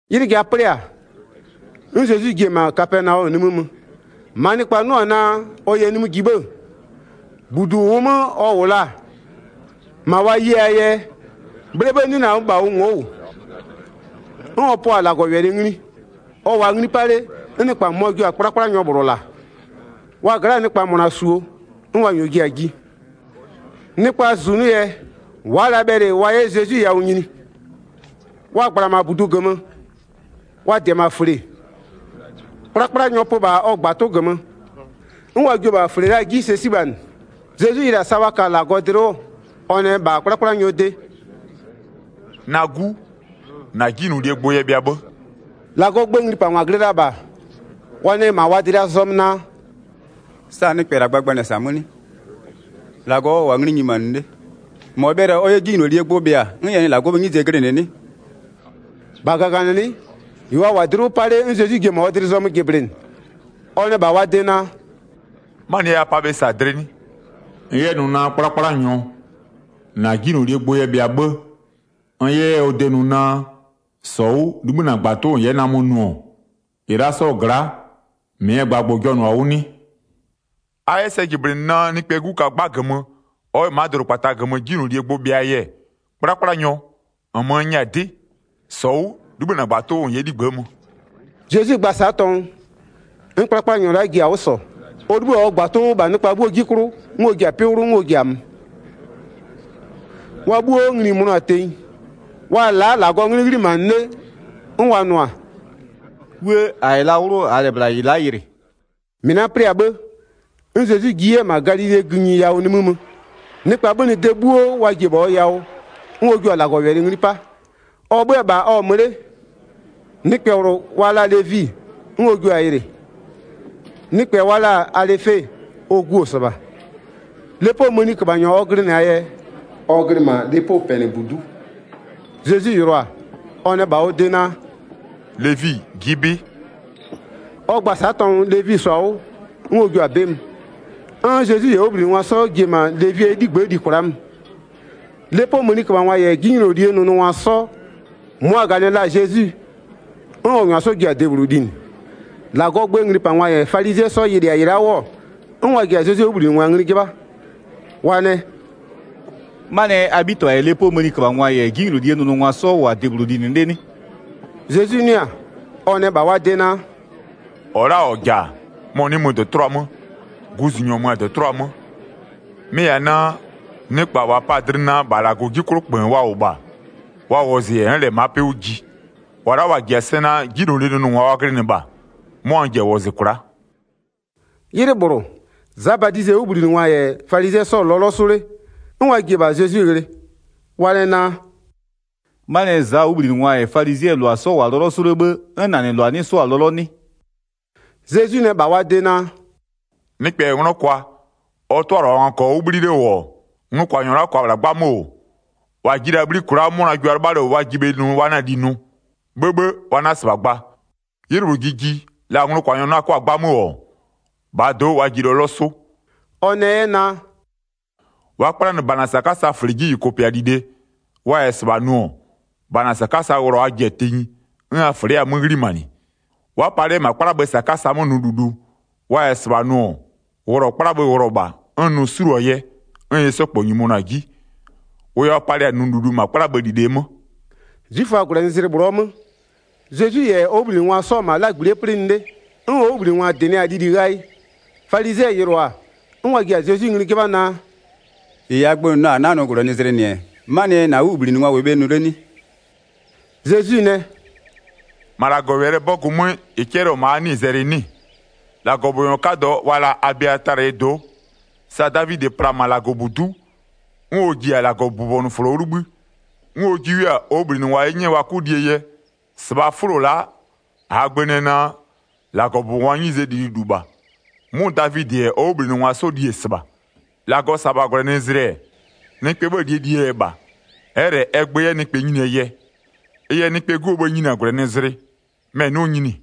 'Ylɩ ja 'plɩ-a, 'n Zezwi ji-e -ma Kapɛnaɔmö nimï mö, -maa nɩkpa 'nʋ-ɔ naa, ɔ yɛ nimï ji 'bhë-ë, 2-budu -ʋʋ 'mö ɔ -wʋ la-a, -ma wa ye-aa yɛ, 'bhlee 'bhë 'nɩ la -bha ʋ ngo'o -wʋ. 'N ɔ pʋa-a -Lagɔwɛlɩ ngli. Ɔ -wʋʋa ngli 'pa 'le, 'n nɩkpa -mʋmʋa jio-a 'kplakplanyɔ -bhlʋ -la, wa gla'aa nɩkpa -mʋna -suo, 'n wa -nyɔɔ ji-a ji. Nɩkpaa -zunʋ yɛ, wa'a la bhɛlɩ wa 'yɛ Zezwi yawʋ nyini. Wa -gbla-a -ma -budu -gömö, wa -dɩ-ɛ -ma -fle, 'kplakplanyɔ pö -bha ɔ -gbatʋ -gömö, 'n wa jio-o -bha -fle la'a 'ji sɛ 'sibhanɩ. Zezwi yɩlɩ-a sa wa kɔ-a dlɩ 'wʋ, ɔ nɛ -bha 'kplakplanyɔɔ de: “Na 'gu, -na 'jinylolie gbʋ yɛ bhɩa 'bhë.” 6-Lagɔɔ gböö nglipangwa glɩ la-a -bha, wa nɛ -ma wa dlɩa zɔmö naa: “Sa nɩkpɛ -la gbagbanɩ-ɛ -sa 'mö 'nɩ? -Lagɔ ɔ -wʋ-a ngli nyimanɩ 'le, -mɔ bhɛlɩ-a ɔ 'yɛ 'jinylolie gbʋ bhɩa, 'n ɛ nɩ -Lagɔɔ 'bhëë 'nyize glɩnɩ 'nɩ?” 8-Bha -gaganɩlɩ'ɩ, -ɩ wa -wʋ-a dlɩ 'wʋ 'pa 'le 'n Zezwi jiɩ-e -ma ɔ dlɩ zɔmö jɩblɩnɩ. Ɔ nɛ -bha wa de naa: “'Manɩɛ yɛ a pa bhe -sa dlɩ 'nɩ? N 'yɛ nʋ naa 'kplakplanyɔ, -na 'jinylolie gbʋ yɛ bhɩa 'bhë, n 'yɛ 'yɛ ɔ de nʋ naa: -Sɔ 'wʋ 'libhï -na -gbatʋ 'wʋ -n 'yɛ namö nʋ-ɔ, -ɩ la'a 'sɔɔ gla'a, -mɩɛ gbagbʋ-ʋ jɔnʋ-a 'wʋ 'nɩ? A 'yɛ sɛ jɩblɩnɩ naa, Nɩkpɛɛ 'Gu ka 'gba -gömö, ɔ 'yɛ ma'a dʋdʋkpata -gömö 'jinylolie gbʋ bhɩaa yɛ, 'kplakplanyɔ, -nmö n nyɛ-a 'dɩ, -sɔ 'wʋ, 'libhï -na -gbatʋ 'wʋ -n 'yɛ 'ligbë'ë mö.” Zezwi gba-a sa'a tɔngʋ, 'n 'kplakplanyɔ la'a ji-a 'wʋ -sɔ, ɔ 'libhï-a ɔ -gbatʋ 'wʋ -bha wa 'bhuoo 'ji 'klʋ, 'n ɔ ji-a 'pɩ 'wlʋ, 'n ɔ ji-a mö. Wa 'bhuo ngli-i mönʋa-a tenyi, wa-a la'a -Lagɔɔ 'nglɩ 'ghlimanɩ 'le, 'n wa nʋ-a: “'Wuë! -A -yɛ la 'wlʋ -aa -lɛ -bhla -ɩ la'a yɩlɩ.” Zezwi yɛ Levi wɔzɩ 13-Mɩ la'a 'plɩ-a 'bhë, 'n Zezwi ji 'yɛ-ɛ -ma Galilee gïnyi yawʋ nimï mö. Nɩkpa 'bhönɩ-a de 'bhuo wa ji-e -bha ɔ yawʋ, 'n ɔ jua-a -Lagɔwɛlɩ ngli 'pa. Ɔ 'bhö-ö -bha ɔ-ɔ mö 'le, nɩkpɛ -bhlʋ wa la-a Levi 'n ɔ jio-a yɩlɩ, nɩkpɛ wa la-a Alɩfe, ɔ gu-o -sɩbha. Lepoo mëniköbhanyɔ ɔ glɩnɩ-aa yɛ, ɔ glɩ -ma lepopɛnɩbudu'u. Zezwi yɩlɩɔ-a, ɔ nɛ -bha ɔ de naa: “Levi ji'i 'bɩ!” Ɔ gba-a sa'a tɔngʋ Levi -sɔ-a 'wʋ, 'n ɔ jio-a 'bɩ mö. 'N Zezwi -yɛ ɔ 'wʋbhlinɩngwa 'sɔ ji-e -ma Levie 'ligbë'ë li kwla'a mö. Lepoo mëniköbhangwa -yɛ 'jinylolie nʋnʋngwa 'sɔ, mʋa-a -ganɩ la-a Zezwi, 'n ɔ -nyʋa 'sɔ ji-a debhlʋ linɩ. 16-Lagɔɔ gböö nglipangwa -yɛ falizɩɛ 'sɔ yɩlɩ-a -ɩ la'a 'wʋ-ɔ, 'n wa ji-a Zezwie 'wʋbhlinɩngwa ngli 'jɩbha, wa nɛ: “'Manɩɛ yɛ a 'bhitɩbha -yɛ lepoo mëniköbhangwa -yɛ 'jinylolie nʋnʋngwa 'sɔ -wʋ-a debhlʋ linɩ 'le 'nɩ?” Zezwi 'nʋɩ-a, ɔ nɛ -bha wa de naa: “-Ɔ la'a -ɔ -ja-a, mɔ-ɔ 'nɩ mö -dɔtʋlʋa 'mö, guzunyɔ mö-a -dɔtʋlʋa 'mö. Mɩ-ɩ -yɛ-a naa: Nɩkpa -wa pa-a dlɩ naa, -bha -Lagɔɔ 'ji 'klʋ -kpöön wa -wʋ -bha, wa wɔzɩ -yɛ n'n -lɛ ma'a 'pɩ 'wʋ ji. -Wa la'a -wa -ji-a sɛ naa, 'jinylolie nʋnʋngwa wa glɩnɩ -bha, 'mʋa n ji-a wɔzɩ kwla'a.” 'Ylɩ -bhlʋ, Za Badizɩɛ 'wʋbhlinɩngwa -yɛ falizɩɛ 'sɔ-ɔ lɔlɔ 'sʋ 'le, 'n wa ji-e -bha Zezwi ghlɩ, wa nɛ naa: “'Manɩɛ yɛ Zaa 'wʋbhlinɩngwa -yɛ falizɩɛ -lʋa 'sɔ -wʋ-a lɔlɔ 'sʋ 'le 'bhë, 'n -na -nɩ -lʋa 'nɩ 'sʋ-a lɔlɔ 'nɩ?” Zezwi nɛ -bha wa de naa: “Nɩkpɛ -yɛ 'nglɔ kwa, ɔ 'tʋalɩbhangwa -kɔɔ 'wʋ 'bhli 'le -wʋ-ɔ, nglʋkwanyɔ la'a -kʋa -bhla 'gbamö -wʋ, -wa ji la-a 'bhli kwla'a 'mʋna jua 'lɩbha 'le -wʋ wa ji bhe nʋ wa 'na-a li nʋ? 'Bhëbhë, wa 'na -sɩbha gba. 'Ylɩ -bhlʋ ji ji, la nglʋkwanyɔ 'na 'kʋa-a 'gbamö -wʋ, -bhaa do'o wa ji lɔlɔ 'sʋ.” Ɔ nɛ 'yɛ naa: “Wa'a 'kplanɩ -bana -sakasaa -fle 'ji -yʋkʋpɩa -lile. Wa -yɛ -sɩbha nʋ-ɔ, -bana -sakasa wʋlɔ a ji-a tenyi, 'n a -fle 'yɛ-a 'mö 'ghlimanɩ. Wa'a palɩ 'yɛ -ma 'kplabhë -sakasa 'mö nʋ -lulu, wa -yɛ -sɩbha nʋ-ɔ, wʋlɔ 'kplabhë wʋlɔ -bha, 'n nʋ 'suluo-a yɛ 'n ɩ 'sɔ -kpɔ nyimonʋ-a 'ji. Wʋ yɛ wa palɩ-a nʋ -lulu 'kplabhë -lile 'mö.” 'Zwiföaa -gwlɛnɩzlɩ -bhlʋɔ 'mö, Zezwi -yɛ ɔ 'wʋbhlinɩngwa 'sɔ-ɔ -ma 'lagbli'ie 'plɩnɩ 'le, 'n ɔ 'wʋbhlinɩngwa -dɩnɩ-a lili ghayɩ. Falizɩɛ yɩlʋa-a, 'n wa ji-a Zezwi ngli 'jɩbha naa: “-Ɩ -aa gbö nʋ la-a -a 'na-a nʋ -gwlɛnɩzlɩ -nɩ-ɛ, 'manɩɛ yɛ -na 'wʋbhlinɩngwa -wɩɩ bhe nʋ 'le 'nɩ?” Zezwi nɛ: “-Ma -Lagɔwɛlɩɛ 'bɔgʋ 'mö, 26-Lagɔbʋbɔnyɔ 'kadɔ wa la-a Abiatalɩɛ do'o, sa Davidɩ pla-a -ma -Lagɔbudu'u, 'n ɔ ji-a -Lagɔbʋbɔnʋfʋlo 'wʋ 'libhï, 'n ɔ jiʋ-a li, 'n ɔ jiʋ 'yɛ-a ɔ 'wʋbhlinɩngwa 'ye 'nyɛ wa 'kʋ lie yɛ, -sɩbhaa 'fʋlo la'a, -aa gbö nɛ naa, -Lagɔbʋbɔngwaa 'nyizee lililu -bha. 'Mʋ Davidɩ -yɛ ɔ 'wʋbhlinɩngwa 'sɔ li-e -sɩbha. 27-Lagɔ -sa-a -bha -gwlɛnɩzlɩ-ɛ, nɩkpɛɛ 'bhëë -lie -lie yɛ -bha, ɛ'ɛ -lɛ ɛ gbö 'yɛ nɩkpɛ nyinie yɛ. Ɩ yɛ Nɩkpɛɛ 'Guo bhë-ë nyini-a -gwlɛnɩzlɩ, mɛ-ɛ 'nɩɔ nyini.”